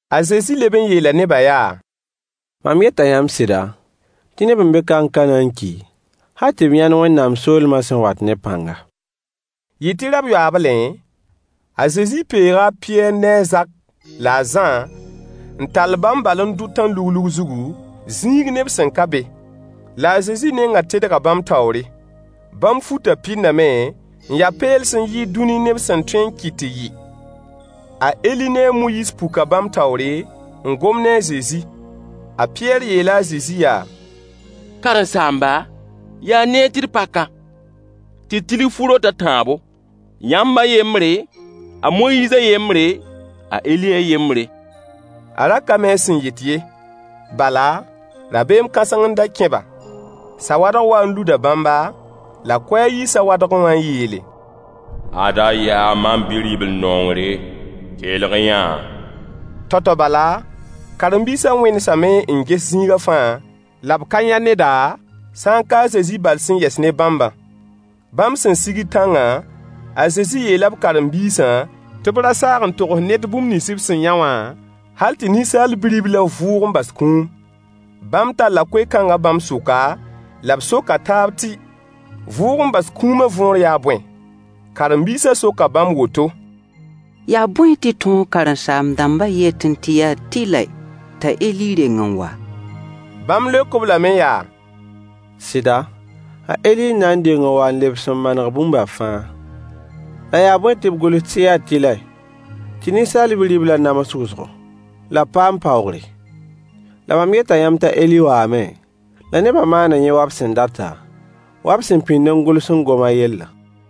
A Zezi leb n yeela nebã yaa: Mam yeta yãmb sɩda, tɩ neb n be ka n ka na n ki hal tɩ b yãnd Wẽnnaam soolemã sẽn wat ne pãnga. Yɩ tɩ rab-yoaablẽ, a Zezi peega a Pɩyɛɛr ne a Zak la a Zã n tall bãmb bal n dʋ tãn-luglug zugu, zĩig neb sẽn ka be. La a Zezi nengã tedga bãmb taoore. Bãmb futã pɩndame, n ya peels n yɩɩd dũni neb sẽn tõe n kɩt tɩ yɩ. A Eli ne a Moyiis puka bãmb taoore, n gom ne a Zezi. A Pɩyɛɛr yeela a Zezi yaa: Karen-saamba, yaa neer tɩ d pa ka, tɩ d tilg fu-rot a tãabo: yãmb a yembre, a Moyiis a yembre, a Eli a yembre. A ra ka mi a sẽn yet ye, bala, rabeem kãseng n da kẽ-ba. Sawadg waa n luda bãmba, la koɛɛg yii sawadgẽ wã n yeele: Ada yaa mam Bi-ribl-nongre. Kelg-y-yã-a. Tao-tao bala, karen-biisã wẽnesame n ges zĩiga fãa, la b ka yã neda, sã n ka a Zezi bal sẽn yɛs ne bãmbã. Bãmb sẽn sigd tãngã, a Zezi yeela b karen-biisã tɩ b ra saag n togs ned bũmb nins b sẽn yã wã, hal tɩ Ninsaal Bi-riblã vʋʋg n bas kũum. Bãmb talla koe-kãng bãmb sʋka, la b soka taab tɩ “vʋʋg n bas kũumã” võor yaa bõe. Karen-biisã soka bãmb woto: Yaa bõe tɩ tõog karen-saam-dãmbã yetẽ tɩ yaa tɩlɛ t'a Eli reng n wa? Bãmb leok-b lame yaa: Sɩda, a Eli n na n deng n wa n lebs n maneg bũmba fãa. La yaa bõe tɩ b gʋls tɩ yaa tɩlɛ tɩ Ninsaal Bi-riblã nams wʋsgo la b paam paoogre? La mam yeta yãmb t'a Eli waame, la nebã maana yẽ wa b sẽn data, wa b sẽn pĩnd n gʋls n gom a yellã.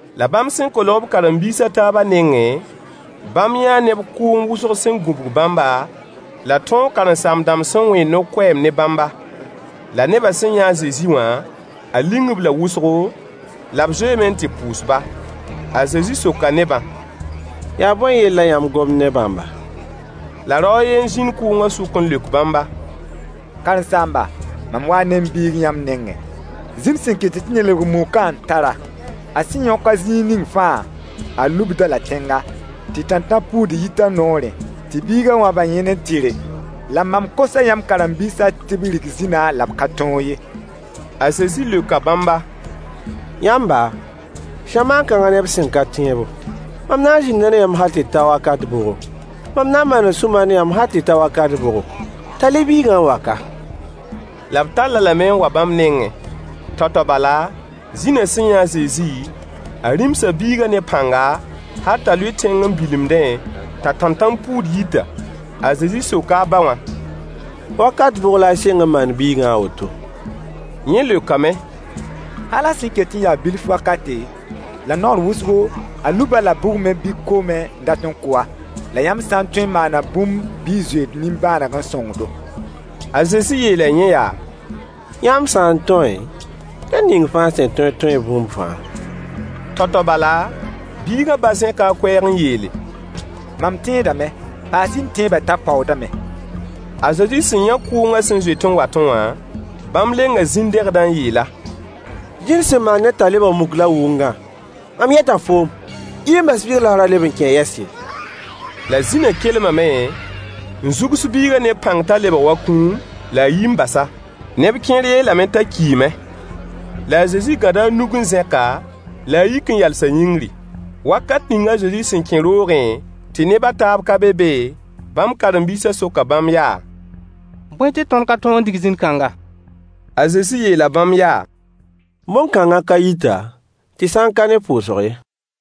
La bãmb sẽn kolg b karen-biis a taabã nengẽ, bãmb yãa neb kʋʋng wʋsg sẽn gũbg bãmba, la tõog karen-saam-dãmb sẽn wẽed no-koɛɛm ne bãmba. La nebã sẽn yã a Zezi wã, a ling-b la wʋsgo, la b zoeeme n tɩ pʋʋs-ba. A Zezi soka nebã: Yaa bõe yell la yãmb gomd ne bãmba? La rao a yen n zĩnd kʋʋngã sʋk n leok bãmba: Karen-saamba, mam waa ne m biig yãmb nengẽ. Zĩn sẽn kɩtd tɩ ned lebg mukã n tar-a. A sẽn yõk-a zĩig ning fãa, a lubd-a-la tẽnga tɩ tãntãn-puud yit a noorẽ, tɩ biigã wãb a yẽn n tɩre. La mam kosa yãmb karen-biisã tɩ b rig zĩnã la b ka tõog ye. A Zezi leoka bãmba: Yãmba, zamaan kãngã neb sẽn ka tẽebo, mam na n zĩnda ne yãmb hal tɩ ta wakat bʋgo? Mam na n maana sũ-mar ne yãmb hal tɩ ta wakat bʋgo? Tall-y biigã n wa ka. La b tall-a lame n wa bãmb nengẽ. Tao-tao bala, zĩnã sẽn yã a Zezi, a rĩmsa biigã ne pãnga, hal t'a lʋɩ tẽng n bilimdẽ t'a tãntãn-puud yita. A Zezi soka a ba wã: Wakat bʋg la a sɩng n maand biigã a woto? Yẽ leokame: Hal a sẽn ket n ya bilf wakate. La naoor wʋsgo, a lub-a-la bugmẽ bɩ koomẽ n dat n kʋ-a. La yãmb sã n tõe n maana bũmb bɩ y zoe d nimbãaneg n sõng-do. A Zezi yeela yẽ yaa: Yãmb sã n tõe? Ned ning fãa sẽn tẽed tõee bũmb fãa. Tao-tao bala, biigã ba zẽka a koɛɛg n yeele: Mam tẽedame. Paas-y m tẽebã t'a paoodame. A Zezi sẽn yã kʋʋngã sẽn zoet n watẽ wã, bãmb lenga zĩn-dẽgdã n yeel-a: Zĩn sẽn maand ned t'a lebg muk la wʋngã, mam yeta foom, yi n bas biigã la f ra leb n kẽ-a yɛs ye. La zĩnã kelmame, n zugs biigã ne pãng t'a lebg wa kũum, la a yi bas-a. Neb kẽer yeelame t'a kiime. La a Zezi gãda a nug n zẽk-a, la a yik n yalsa yĩngri. Wakat ning a Zezi sẽn kẽ roogẽ tɩ neb a taab ka be be, bãmb karen-biisã soka bãmb yaa: Bõe tɩ tõnd ka tõog n dig zĩn-kãngã? A Zezi yeela bãmb yaa: Bõn-kãngã ka yita, tɩ sã n ka ne pʋʋsg ye.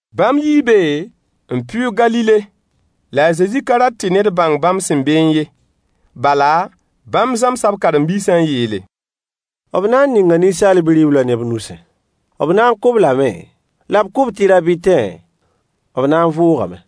Bãmb yii be n pɩʋʋg Galile. La a Zezi ka rat tɩ ned bãng bãmb sẽn beẽ ye. Bala, bãmb zãmsa b karen-biisã n yeele: B na n ninga Ninsaal Bi-riblã neb nusẽ. B na n kʋ-b lame, la b kʋ-b tɩ rab tãtẽ, b na n vʋʋgame.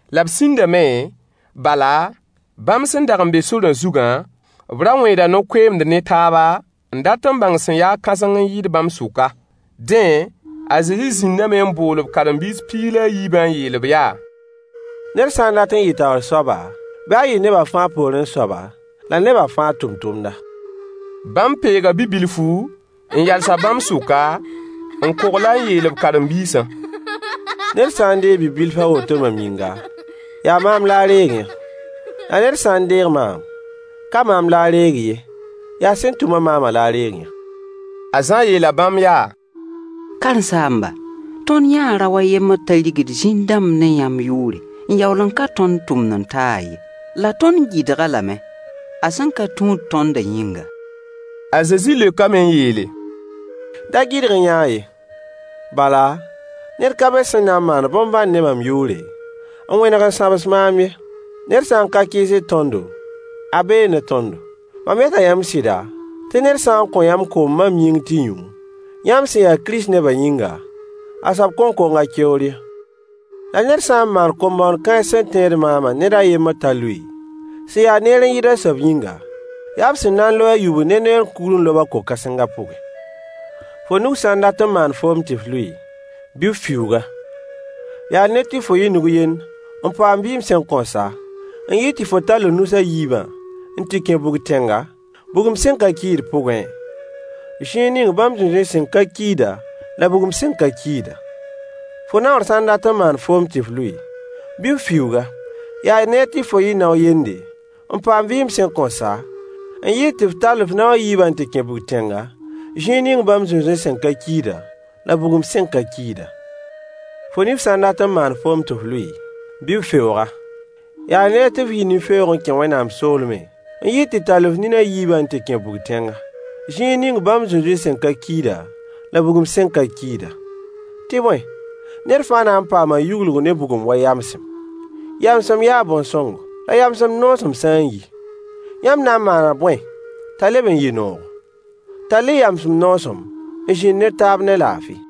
La b sĩndame, bala, bãmb sẽn dag n be sorã zugã, b ra wẽeda no-koeemd ne taaba n dat n bãng sẽn ya-a kãseng n yɩɩd bãmb sʋka. Dẽ, a Zezi zĩndame n bool b karen-biis piig la a yiibã n yeel-b yaa: Ned sã n dat n yɩ taoor soaba, bɩ a yɩ neba fãa poorẽ soaba, la neba fãa tʋmtʋmda. Bãmb peega bi-bilfu n yals-a bãmb sʋka, n kogl-a n yeel b karen-biisã: Ned sã n deeg bi-bilf a woto mam yĩnga, yaa maam la a reeg-yã. La ned sã n deeg maam, ka maam la a reegɩ ye, yaa sẽn tʋm-a maamã la a reeg-yã. A Zã yeela bãmb yaa: Karen-saamba, tõnd yãa rao a yembr t'a rigd zĩn-dãmb ne yãmb yʋʋre, n yaool n ka tõnd tũud-n-taag ye. La tõnd gɩdg-a lame a sẽn ka tũud tõndã yĩnga. A Zezi leokame n yeele: Da gɩdg-y-yã-a ye, bala, ned ka be sẽn na n maan bõn-bãnd ne mam yʋʋre, n wẽneg n sãbs maam ye. Ned sã n ka kɩɩsd tõndo, a bee ne tõndo. Mam yeta yãmb sɩda, tɩ ned sã n kõ yãmb koom mam yĩng tɩ y yũ, yãmb sẽn ya Kirist nebã yĩnga, a soab kõn kong a keoor ye. La ned sã n maan kom-bõoneg kãens sẽn tẽed maamã ned a yembr t'a lʋɩ, sẽn ya neer n yɩɩd a soab yĩnga, yaa b sẽn na n loe a yubl ne neer kugr n lob-a ko-kãsengã pʋgẽ. Fo nug sã n dat n maan foom tɩ f lʋɩ, bɩ f fiuug-a. Yaa neer tɩ fo yɩ nug-yend n paam vɩɩm sẽn kõn sa, n yɩɩd tɩ fo tall f nus a yiibã n tɩ kẽ bug-tẽnga, bugum sẽn ka kiid pʋgẽ, [ zĩig ning bãmb zũnzũy sẽn ka kiida la bugum sẽn ka kiida.] Fo naoor sã n dat n maan foom tɩ f lʋɩ, bɩ f fiuug-a. Yaa neer tɩ fo yɩ nao-yende, n paam vɩɩm sẽn kõn sa, n yɩɩd tɩ f tall f nao a yiibã n tɩ kẽ bug-tẽnga, [ zĩig ning bãmb zũnzũy sẽn ka kiida, la bugum sẽn ka kiida.] Fo nif sã n dat n maan foom tɩ f lʋɩ, bɩ f feoog-a. Yaa neer tɩ f yɩ nin-feoog n kẽ Wẽnnaam soolmẽ, n yɩɩd tɩ tall f nin a yiibã n tɩ kẽ bug-tẽnga, “zĩig ning bãmb zũnzũy sẽn ka kiida la bugum sẽn ka kiida.” Tɩ bõe, ned fãa na n paama yuglg ne bugum wa yamsem. Yamsem yaa bõn-sõngo. La yamsem noosem sã n yi, yãmb na n maana bõe t'a leb n yɩ noogo? Tall-y yamsem noosem n zĩnd ne taab ne laafɩ.